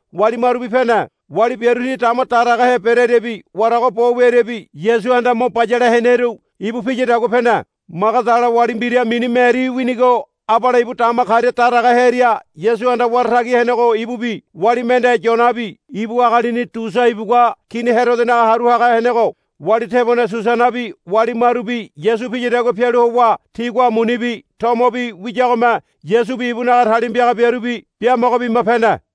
wali marubi pene. Wali biaru ti dama daragahe bereariabi warago bo wiariabi Yasuhanda mo bayale heneru ibu piyadagua pene. Magadala wali mbira mini Meri winigo abale ibu dama karia daraga hearia Yasuhanda wara tagi henego ibubi wali mende Yoanabi ibu agalini Tusa ibugua Kini Herodonaga haru haga henego wali tebone Susanabi wali marubi Yasu piyadagua pialu howa tigua munibi tomobi wiyagome Yasubi ibunaga talima piaga biarubi biamogo bima pene.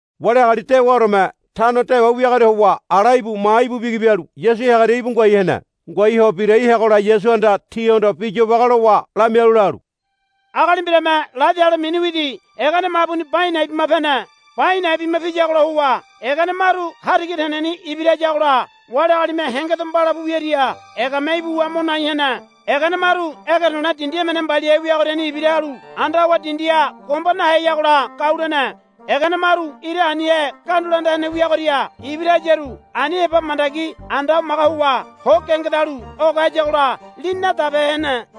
Wali agali dewaoreme tano dewa wiagoria howa ala íbu maha íbu bigi bialu Yasu heagoria ngoai hene. Ngoai ho birai heagola Yasuhanda tihondo bi yobage lowa lamialu lalu, Agali mbirame ladi ale mini widi egene mabuni ba a̱i̱ na̱i̱ bima pene. Ba a̱i̱ na̱i̱ bima piyagola howa egene maru hariga teneni ibira hayagola wali agalime hengedo mbalapu wiaria egame ibuwa mo nai hene. Egene maru ege to̱le̱ dindi emene mbaliahe wiagoriani ibira halu anda howa dindiha gomba naheyagola gau lene. Egene maru ira anihe gandula anda hene wiagoria ibira hayaru ani heba mandagi anda hamaga howa ho gengedalu oge hayagola lini nadabehe hene.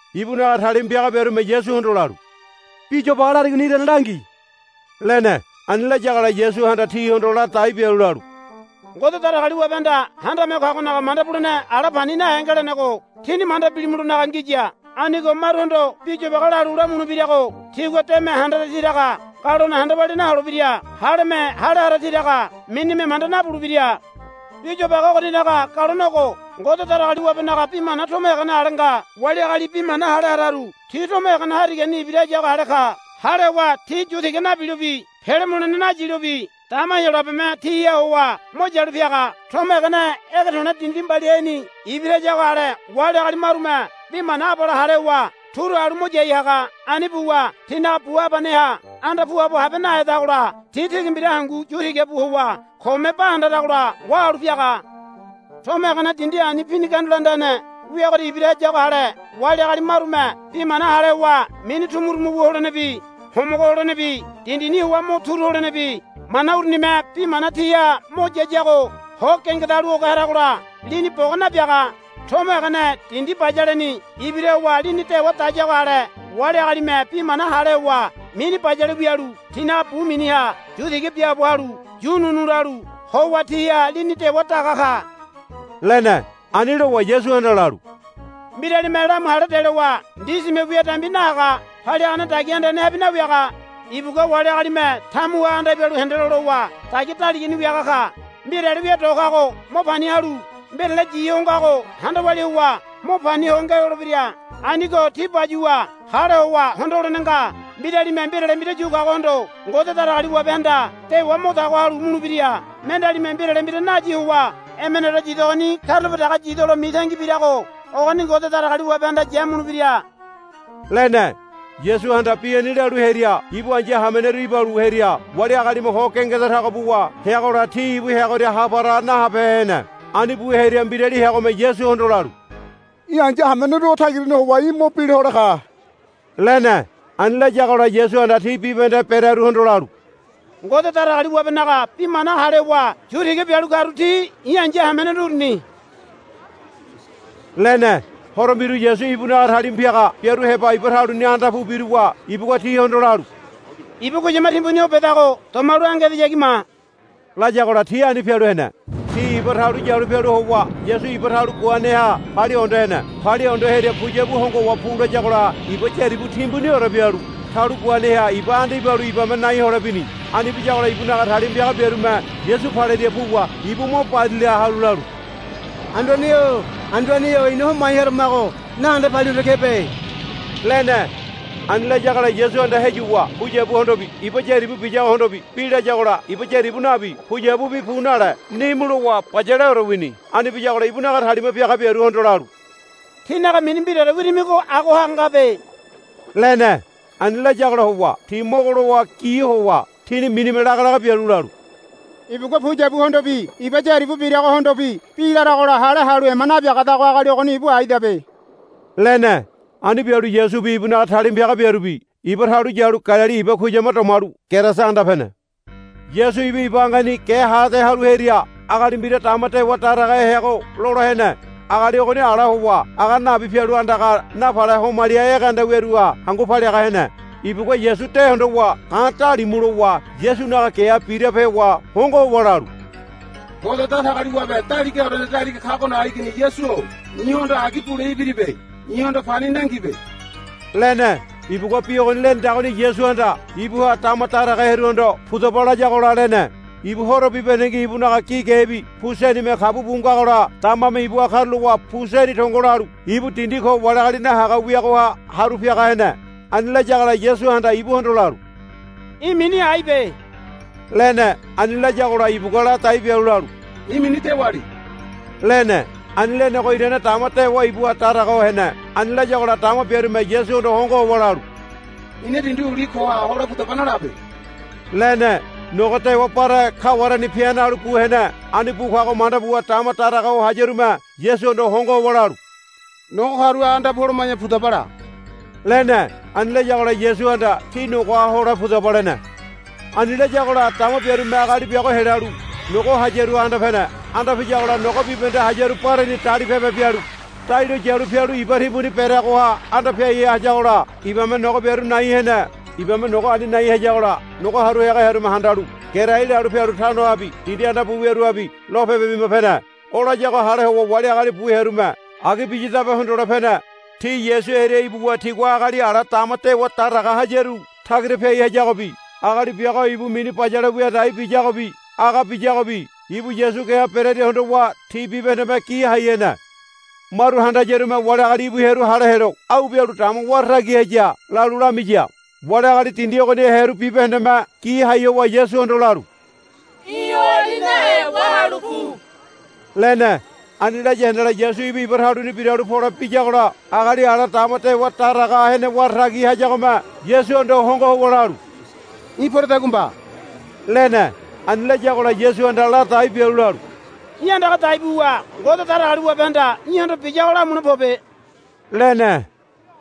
Ibunaga talima piaga biarume Yasuhondo lalu, Bi yobage larigoni irane langi, lene. Ani layagola Yasuhanda tihondo ladai bialu lalu, Ngode Datagaliwabehanda Handame Ho Kagonaga manda bulene ala pani nahe ngelenego tíni manda bilimulonaga ngiya. Anigo maruhondo bi yobage lalu lamulebirago tigua deme handara tiraga galone handa walia naholebira. Haleme hale hara tiraga minime manda nabulebira. Bi yobage ogoninaga galone ogo. Ngode Datagaliwabenaga bi mana tomo egene ale nga. Wali agali bi mana hale hararu ti tomo egene harigani ibira hayago ale ka. Hale howa ti yu tiga nabilobi pele mulene nayilobi dama Heyolabeme tiha howa mo yalu piaga. Tomo egene ege to̱le̱ dindi mbaliaheni ibira hayago ale wali agali marume bi mana abale hale howa turu halu mo yai haga. Ani buwa tinaga bu habaneha anda puabo habe nahedagola ti tigi mbira hangu yu tiga bu howa kome ba handaragola wahalu piaga. Tomo egene dindi ani pini gandula anda hene wiagoria ibira hayago ale wali agali marume bi mana hale howa mini tumutumu wu holenebi homogo holenebi dindini howa mo turu holenebi mana urunime bi mana tiha mo yayago ho gengedalu oge haragola lini boga nabiaga. Tomo egene dindi bayaleni ibira howa lini dewa dayago ale wali agalime bi mana hale howa mini bayale wialu tinaga bu miniha yu tiga biaabo halu yu ununu lalu howa tiha lini dewa daga ka, lene. Ani lowa Yasuhanda lalu, Mbiralime lamu hale delowa ndisime wia dambi nahaga paliagane dagia andanehabi nawiaga. Ibugua wali agalime tamuha anda ibalu hendelo lowa dagia daligani wiaga ka. Mbirale wia do kago mo pani halu mbirale yi ho ngago handa walia howa mo pani ho ngelolebira. Anigo tí bayuwa hale howa hondo holene nga. Mbiralime mbirale mbira yu kagohondo Ngode Datagaliwabehanda dewa mo tago halu mulebira. Mendealime mbirale mbira nayi howa emeneore yidogoni karulape dege yidolo mitangi birago ogoni Ngode Datagaliwabehanda yamulebira, lene. Yasuhanda bi ani lalu hearia ibu aíya hameneru ibalu hearia wali agalime ho gengeda tago buwa heagola ti ibu heagoria ha para nahabehe hene. Ani bu hearia mbirali heagome Yasuhondo lalu. Í̠ ai̱ya hameneru o tagirani howa í̠ mo bila hole ka, lene. Ani layagola Yasuhanda ti bibahende berearuhondo lalu, Ngode Datagaliwabenaga bi mana hale howa yu tiga bialu karu ti i̱ ai̱ya hameneru uruni, lene. Horo mbiru Yasu ibunaga talima piaga biaru heba iba taluni anda pu biruwa ibugua tihondo lalu, Iba kuyama timbuni o bedago domalu ange edeyagi ma, layagola ti ani pialu hene. Ti iba talu yalu pialu howa Yasu ibu talu guaneha palia hondo hene. Palia hondo hearia puyabu hongo howa pu layagola iba yaribu timbuniore bialu talu guaneha iba anda ibalu ibame nai hole bini. Ani biyagola ibunaga talima piaga biarume Yasu palearia puwa ibu mo barila halu lalu, Anduane-o Anduane-o, ina homai haramago nahende palia hondo kebe, lene. Ani layagola Yasuhanda heyuwa puyabuhondobi iba yaribu biyagohondobi bi layagola iba yaribu nabi puyabubi pu nale nimu lowa bayaleore wini. Ani biyagola ibunaga talima piaga biaruhondo lalu, Tínaga mini mbiraore wirimigo agoha ngabe, lene. Ani layagola howa ti mogo lowa gi howa tini minime laga laga bialu lalu, Ibugua puyabuhondobi iba yaribu biragohondobi bi laragola hale halu ema nabiagadago agali ogoni ibu aidabe, lene. Ani bialu Yasubi ibunaga talima piaga biarubi iba talu yalu Galili iba kuyama domalu Gerasa anda pene. Yasu ibu iba angeni ge ha ade halu hearia agali mbira dama dewa daragahe heago lola hene. Agali ogoni ala howa aga nabi pialu andaga napale homali egeanda wiaruha hangu paliaga hene. Ibugua Yasu de hondowa ga̱ dalimu lowa Yasunaga geha birape howa hongo howa lalu, Ngode Datagaliwabe Daligaorene Daliga Kagonaga Igini Yasu-o i̱hondo agi bule ibiribe. I̱hondo pani nangibe, lene. Ibugua bi ogoni lenedagoni Yasuhanda ibuha dama daraga hearuhondo, Pudaba, layagola lene. Ibu horo bibahendengi ibunaga gi gebi pu senime kabu bu ngagola damame ibuha karulowa pu seni tongo lalu ibu dindi ko wali agali nahaga wiagoha haru piaga hene. Ani layagola Yasuhanda ibuhondo lalu, Í̠ mini aibe, lene. Ani layagola ibugua ladai bialu lalu, I̱ mini Dewali, lene. Ani lenego irane dama dewa ibuha daraga ho hene. Ani layagola dama biarume Yasuhondo hongo howa lalu, Ina dindi uli koha hole pudaba nalabe, lene. Nogo dewa bare kawareni pi̱a̱ nalu bu hene. Ani bu kago manda buwa dama daraga ho hayarume Yasuhondo hongo howa lalu, Nogo karuha anda pu holoma̱ya pudaba la, lene. Ani layagola Yasuhanda, Tí nogoha hole pudaba, lene. Ani layagola dama biarume agali biago helalu nogo hayaruha anda pene. Anda piyagola nogo bibahende hayaru bareni dalipebe bialu dai lo yalu pialu iba timbuni bereagoha anda piai hayagola ibame nogo biaru nai hene. Ibame nogo ani nai hayagola nogo haru haga hearume handalu gerai lalu pialu tanohabi dindi anda bu wiaruhabi lopebe bima pene. O layago hale howa wali agali bu hearume agi biyadabe hondole pene. Ti Yasu hearia ibuwa tigua agali ala dama dewa daraga hayaru tagira piai hayagobi agali biago ibu mini bayale wia dai biyagobi aga biyagobi ibu Yasu geha berearia hondowa ti bibahendeme gi hai hene. Maru handayarume wali agali íbu hearu hale helo, Au bialu dama wara tagi haya, lalu lamiya. Wali agali dindi ogoniha hearu bibahendeme gi hai howa Yasuhondo lalu, Í̠ oali nahe wahalu pu, lene. Ani laya handala Yasu ibu iba taluni biralu pole biyagola agali ala dama dewa daraga hene wara tagi hayagome Yasuhondo hongo howa lalu, Í̠ poredagua mba, lene. Ani layagola Yasuhanda ladai bialu lalu, Í̠ andaga dai buwa Ngode Datagaliwabehanda í̠hondo biyago lamule pobe, lene.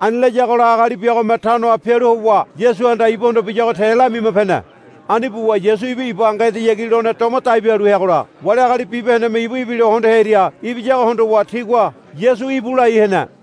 Ani layagola agali biagome tanoha pialu howa Yasuhanda ibuhondo biyago te lamima pene. Ani buwa Yasu ibu iba ange edeyagi lone doma dai bialu heagola wali agali bibahendeme ibu ibilo hondo hearia ibiyago hondowa tigua, Yasu íbu, lai hene.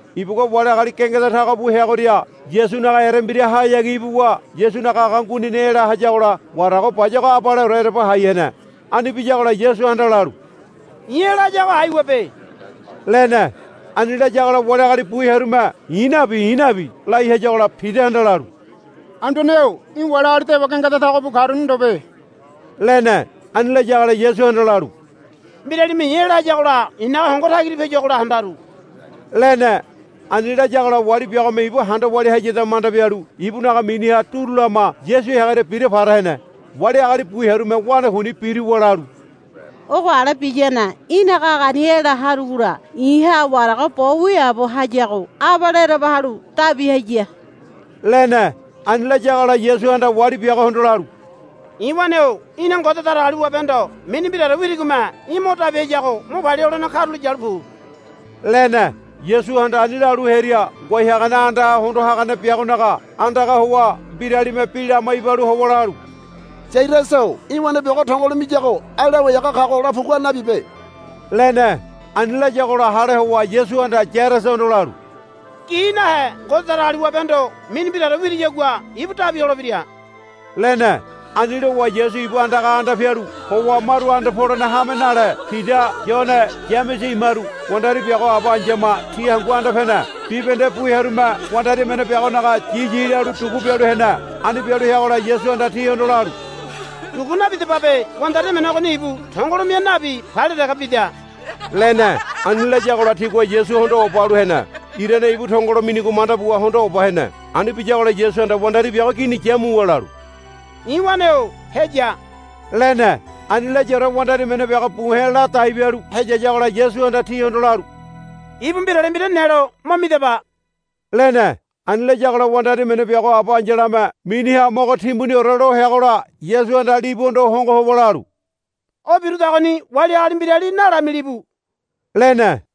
Ibugua wali agali gengeda tago bu heagoria Yasunaga erembirahayagi ibuwa Yasunaga aga nguinini ela hayagola warago bayago abaleore ereba hai hene. Ani biyagola Yasuhanda lalu, I̱ ela hayago aiwabe, lene. Ani layagola wali agali bu hearume, I̱ nabi, I̱ nabi, lai hayagola Pidahanda lalu, Anduane-o í̠ wali agali dewa gengeda tago bu karuni ndobe, lene. Ani layagola Yasuhanda lalu, Mbiralime i̱ ela hayagola i̱naga hongo tagira piayuagola handaru, lene. Ani layagola wali biagome ibu handa walia hayada manda bialu ibunaga miniha duru lama Yasu heagoria bira para hene. Wali agali bu hearume wanakuini biruwa lalu, Ogo ale biyane í̠naga agani ela harugola i̱ha warago bo wiaabo hayago abale ereba halu dabi haya, lene. Ani layagola Yasuhanda wali biagohondo lalu, I̱ wane-o í̠na Ngode Datagaliwabehondo mini mbiraore wirigome í̠ mo dabi hayago mo palia holene karulo yalu pu, lene. Yasuhanda ani lalu hearia ngoai hagane andaha hondo hagane biagonaga andaga howa mbiralime bi lama ibalu howa lalu, Yairasa-o í̠ wane biago tongolo miyago ai Lawai haga kago la pugua nabibe, lene. Ani layagola hale howa Yasuhanda Yairasahondo lalu, Gi nahe Ngode Datagaliwabehondo mini mbiraore wiriyagua ibu dabi holebira, lene. Ani lowa Yasu ibu andaga anda pialu howa maru anda polene hame nale Pida Yone Yamese imaru wandari biago aba ai̱yama ti hangu anda pene. Bibahende bu hearume wandari emene biagonaga yiyi lalu dugu bialu hene. Ani bialu heagola Yasuhanda tihondo lalu, Dugu nabidababe. Wandari emene ogoni ibu tongolo mia nabi palia dege bida, lene. Ani layagola tigua Yasu hondo oba halu hene. Irane ibu tongolo minigo manda buwa hondo oba hene. Ani biyagola Yasuhanda wandari biago gini yamuwa lalu, I̱ wane-o heya, lene. Ani layaore wandari emene biago buhe̱ ladai bialu heyayagola Yasuhanda tihondo lalu, Ibu mbirale mbira nelo mo midaba, lene. Ani layagola wandari emene biago aba ai̱yalame miniha mogo timbuniore lo heagola Yasuhanda libuhondo hongo howa lalu, O birudagoni wali agali mbirali nalamilibu, lene.